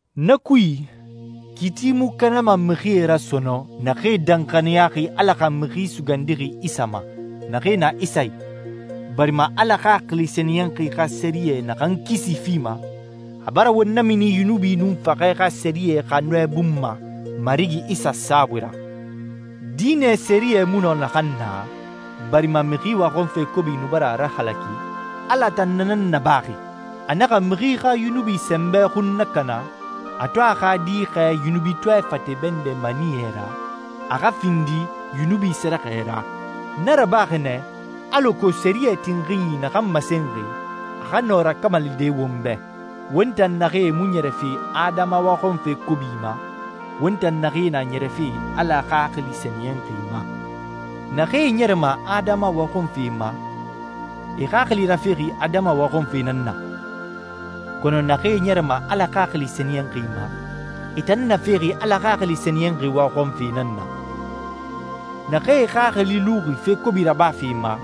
Na kui, kiiti mu kanama mixie ra sɔnɔn naxee danxaniyaxi Ala xa Mixi Sugandixi Isa ma, naxee na Isa i, barima Ala Xaxili Sɛniyɛnxi xa sɛriyɛ naxan kisi fima, a bara won namini yunubi nun faxɛ xa sɛriyɛ xa nɔɛ bun ma Marigi Isa saabui ra. Diinɛ sɛriyɛ mu nɔ naxan na, barima mixi waxɔnfe kobi nu bara a rahalaki, Ala tan na nan nabaxi. A naxa mixi xa yunubi sɛnbɛ xun nakana a to a xa Di xɛɛ yunubitɔɛ fate bɛndɛ maniyɛ ra a xa findi yunubi sɛrɛxɛ ra. Na rabaxi nɛ, alako sɛriyɛ tinxinyi naxan masenxi, a xa nɔ rakamalide won bɛ, won tan naxee mu ɲɛrɛfe adama waxɔnfe kobi ma, won tan naxee na ɲɛrɛfe Ala Xaxili Sɛniyɛnxi ma. Naxee ɲɛrɛma adama waxɔnfe ma, e xaxili rafexi adama waxɔnfe nan na. Kɔnɔ naxee ɲɛrɛma Ala Xaxili Sɛniyɛnxi ma, e tan nafexi Ala Xaxili Sɛniyɛnxi waxɔnfe nan na. Naxee e xaxili luxi fe kobi rabafe ma,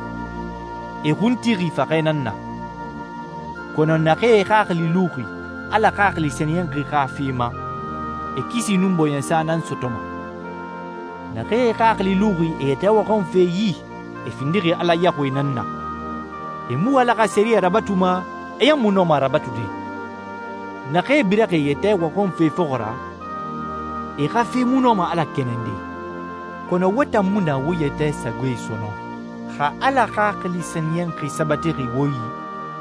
e xun tixi faxɛ nan na. Kɔnɔ naxee e xaxili luxi Ala Xaxili Sɛniyɛnxi xa fe ma, e kisi nun bɔɲɛsa nan sɔtɔma. Naxee e xaxili luxi e yɛtɛ waxɔnfe yi, e findixi Ala yaxuie nan na. E mu Ala xa sɛriyɛ rabatuma, e ɲan mu nɔma a rabatude. Naxee biraxi e yɛtɛ waxɔnfe fɔxɔ ra, e xa fe mu nɔma Ala kɛnɛnde. Kɔnɔ wo tan mu na wo yɛtɛ sagoe sɔnɔn. Xa Ala Xaxili Sɛniyɛnxi sabatixi wo i,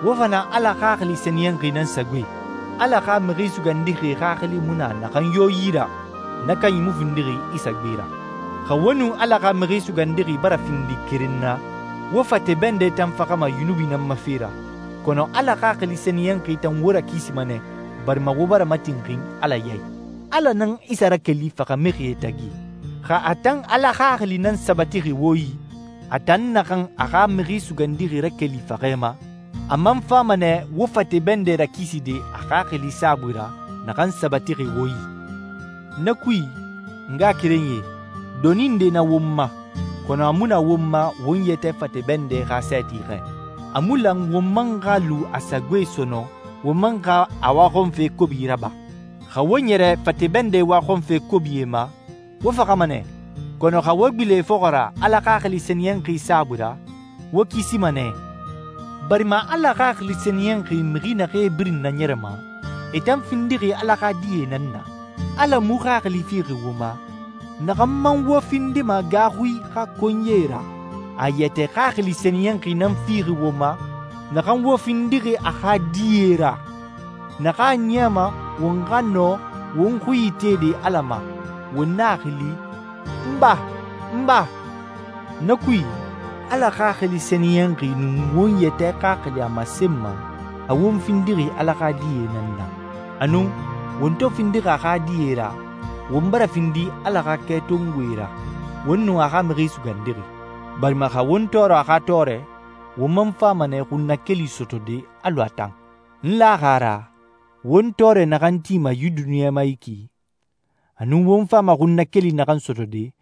wo fa na Ala Xaxili Sɛniyɛnxi nan sagoe. Ala xa Mixi Sugandixi Xaxili mu na naxan yo yi ra, na kanyi mu findixi Isa gbe ra. Xa wo nun Ala xa Mixi Sugandixi bara findi keren na, wo fate bɛndɛ tan faxama yunubi nan ma fe ra, kɔnɔ Ala Xaxili Sɛniyɛnxi tan wo rakisima nɛ barima wo bara matinxin Ala ya i. Ala nan Isa rakeli faxamixie tagi. Xa a tan Ala Xaxili nan sabatixi wo i, a tan naxan a xa Mixi Sugandixi rakeli faxɛ ma, a man fama nɛ wo fate bɛndɛ rakiside a Xaxili saabui ra naxan sabatixi wo i. Na kui, n ngaxakerenyie, doni nde na won ma, kɔnɔ a mu na won ma won yɛtɛ fate bɛndɛ xa sɛɛti xɛ. A mu lan won man xa lu a sagoe sɔnɔn won man xa a waxɔnfe kobi raba. Xa wo ɲɛrɛ fate bɛndɛ waxɔnfe kobie ma, wo faxama nɛ, kɔnɔ xa wo gbilen e fɔxɔ ra Ala Xaxili Sɛniyɛnxi saabui ra, wo kisima nɛ, barima Ala Xaxili Sɛniyɛnxi mixi naxee birin naɲɛrɛma, e tan findixi Ala xa die nan na. Ala mu xaxili fixi wo ma naxan man wo findima gaaxui xa konyie ra. A a yɛtɛ Xaxili Sɛniyɛnxi nan fixi wo ma naxan wo findixi a xa die ra, naxan a niyama won xa nɔ won xui itede Ala ma, won na a xili, «N Ba, n Ba!» Na kui, Ala Xaxili Sɛniyɛnxi nun won yɛtɛ xaxili a masenma a won findixi Ala xa die nan na. Anun, won to findixi a xa die ra, won bara findi Ala xa kɛtongoe ra, won nun a xa Mixi Sugandixi. Barima, xa won tɔɔrɔ a xa tɔɔrɛ, won man fama nɛ xunnakeli sɔtɔde alɔ a tan. N laxi a ra won tɔɔrɛ naxan tima yi duniɲa ma yi ki, a nun won fama xunnakeli naxan sɔtɔde,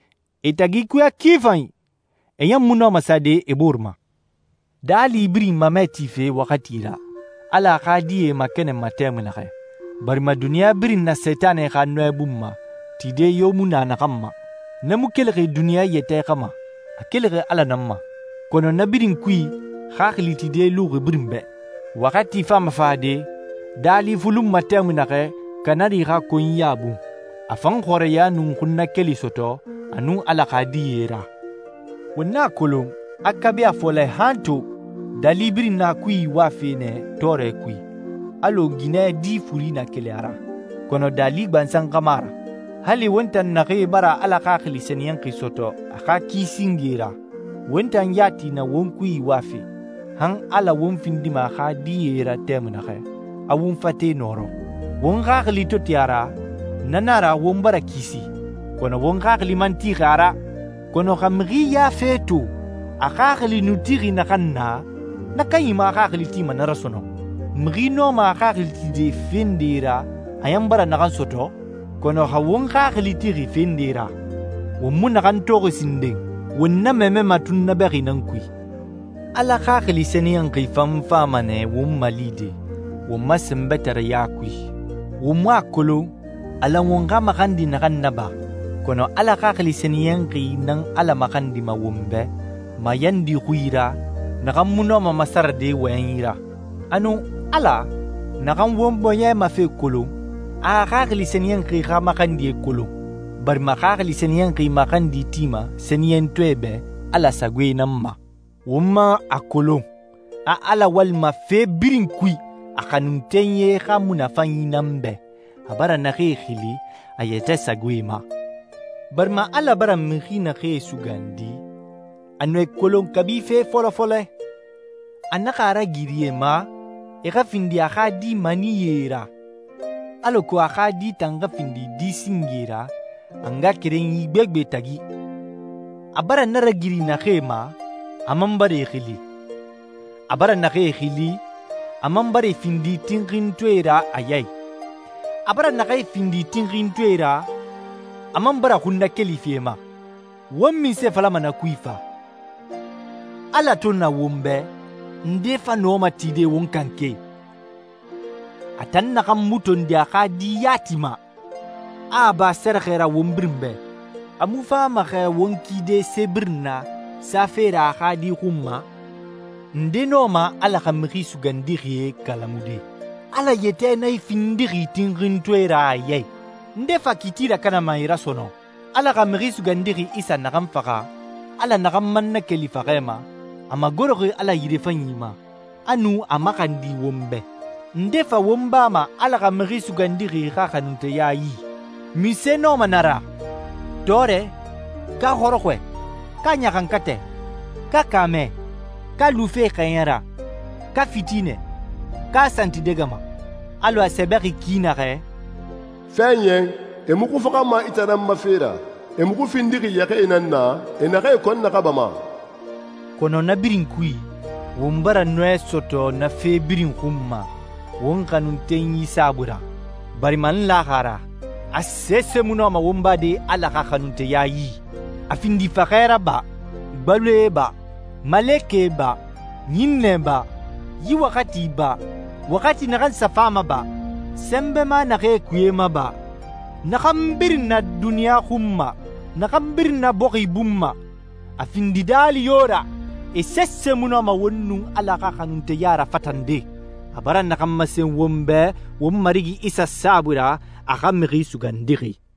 e tagi ikuya ki fanyi! E ɲan mu nɔma sade e boore ma. Daali birin mamɛ tife waxati ra, Ala a xa die makɛnɛnma tɛmui naxɛ, barima duniɲa birin na Sentanɛ xa nɔɛ bun ma, tide yo mu naxan ma. Na mu kelixi duniɲa yɛtɛ xa ma, a kelixi Ala nan ma. Kɔnɔ na birin kui xaxili tide luxi birin bɛ. Waxati fama fade daali fulunma tɛmui naxɛ kanari xa konyiya bun, a fan xɔrɛya nun xunnakeli sɔtɔ a nun Ala xa die ra. Won a kolon, a kabi a fɔlɛ han to, daali birin na a kui iwafe nɛ tɔɔrɛ kui, alɔ ginɛ di furi na keli a ra. Kɔnɔ daali gbansan xa mu a ra. Hali won tan naxee bara Ala Xaxili Sɛniyɛnxi sɔtɔ a xa ki singe ra, won tan yati na won kui iwafe, han Ala won findima a xa die ra tɛmui naxɛ, a won fate nɔrɔ. Won xaxili to ti a ra, na nan a ra won bara kisi, kɔnɔ won xaxili man tixi a ra. Kɔnɔ xa mixi ya fe to a xaxili nu tixi naxan na, na kanyi mu a xaxili tima na ra sɔnɔn. Mixi nɔma a xaxili tide fe nde ra a ɲan bara naxan sɔtɔ? Kɔnɔ xa won xaxili tixi fe nde ra won mu naxan toxi sinden, won na mamɛma tunnabɛxi nan kui. Ala Xaxili Sɛniyɛnxi fan fama nɛ won malide won ma sɛnbɛtareya kui. Won mu a kolon a lan won xa maxandi naxan naba, kɔnɔ Ala Xaxili Sɛniyɛnxi nan Ala maxandima won bɛ mayandi xui ra naxan mu nɔma masarade wɔyɛnyi ra. Anun, Ala, naxan won bɔɲɛ ma fe kolon, a a Xaxili Sɛniyɛnxi xa maxandie kolon, barima Xaxili Sɛniyɛnxi maxandi tima sɛniyɛntɔɛe bɛ Ala sagoe nan ma. Won man a kolon a Ala walima fe birin kui a xanuntenyie xa munafanyi nan bɛ, a bara naxee xili a yɛtɛ sagoe ma. Barima Ala bara mixi naxee sugandi, a nu e kolon kabi fe fɔlɔ fɔlɛ, a naxa a ragiri e ma e xa findi a xa Di maniyɛe ra, alako a xa Di tan xa findi di singe ra a ngaxakerenyi gbegbe tagi. A bara na ragiri naxee ma, a man bara e xili. A bara naxee xili, a man bara e findi tinxintɔɛe ra a ya i. A bara naxee findi tinxintɔɛe ra, a man bara xunnakeli fi e ma. Won munse falama na kui fa? Ala to na won bɛ, nde fa nɔma tide won kanke? A tan naxan mu tondi a xa Di yati ma, a a ba sɛrɛxɛ ra won birin bɛ, a mu fama xɛ won kide se birin na safe ra a xa Di xun ma? Nde nɔma Ala xa mixi sugandixie kalamude? Ala yɛtɛ nan e findixi tinxintɔɛe ra a ya i. Nde fa kiiti rakanama e ra sɔnɔn? Ala xa Mixi Sugandixi Isa naxan faxa, Ala naxan man nakeli faxɛ ma, a magoroxi Ala yirefanyi ma, a nu a maxandi won bɛ. Nde fa won bama Ala xa Mixi Sugandixi xa xanunteya yi? Munse nɔma na ra? Tɔɔrɛ, ka xɔrɔxɔɛ, ka ɲaxankatɛ, ka kaamɛ, ka lufe xɛɲɛ ra, ka fitinɛ, ka santidɛgɛma? Alɔ a sɛbɛxi ki naxɛ, «Fɛɛɲɛn, e muxu faxama i tan nan ma fe ra. E muxu findixi yɛxɛɛe nan na e naxee kɔn naxabama.» Kɔnɔ na birin kui, won bara nɔɛ sɔtɔ na fe birin xun ma won xanuntenyi saabui ra. Barima n laxi a ra, a sese mu nɔma won bade Ala xa xanunteya yi. A findi faxɛ ra ba, gbaloe ba, malekɛ ba, ɲinnɛe ba, yi waxati ba, waxati naxan sa fama ba, sɛnbɛma naxee kuye ma ba, naxan birin na duniɲa xun ma, naxan birin na bɔxi bun ma, a findi daali yo ra, e sese mu nɔma won nun Ala xa xanunteya rafatande, a bara naxan masen won bɛ won Marigi Isa saabui ra, a xa Mixi Sugandixi!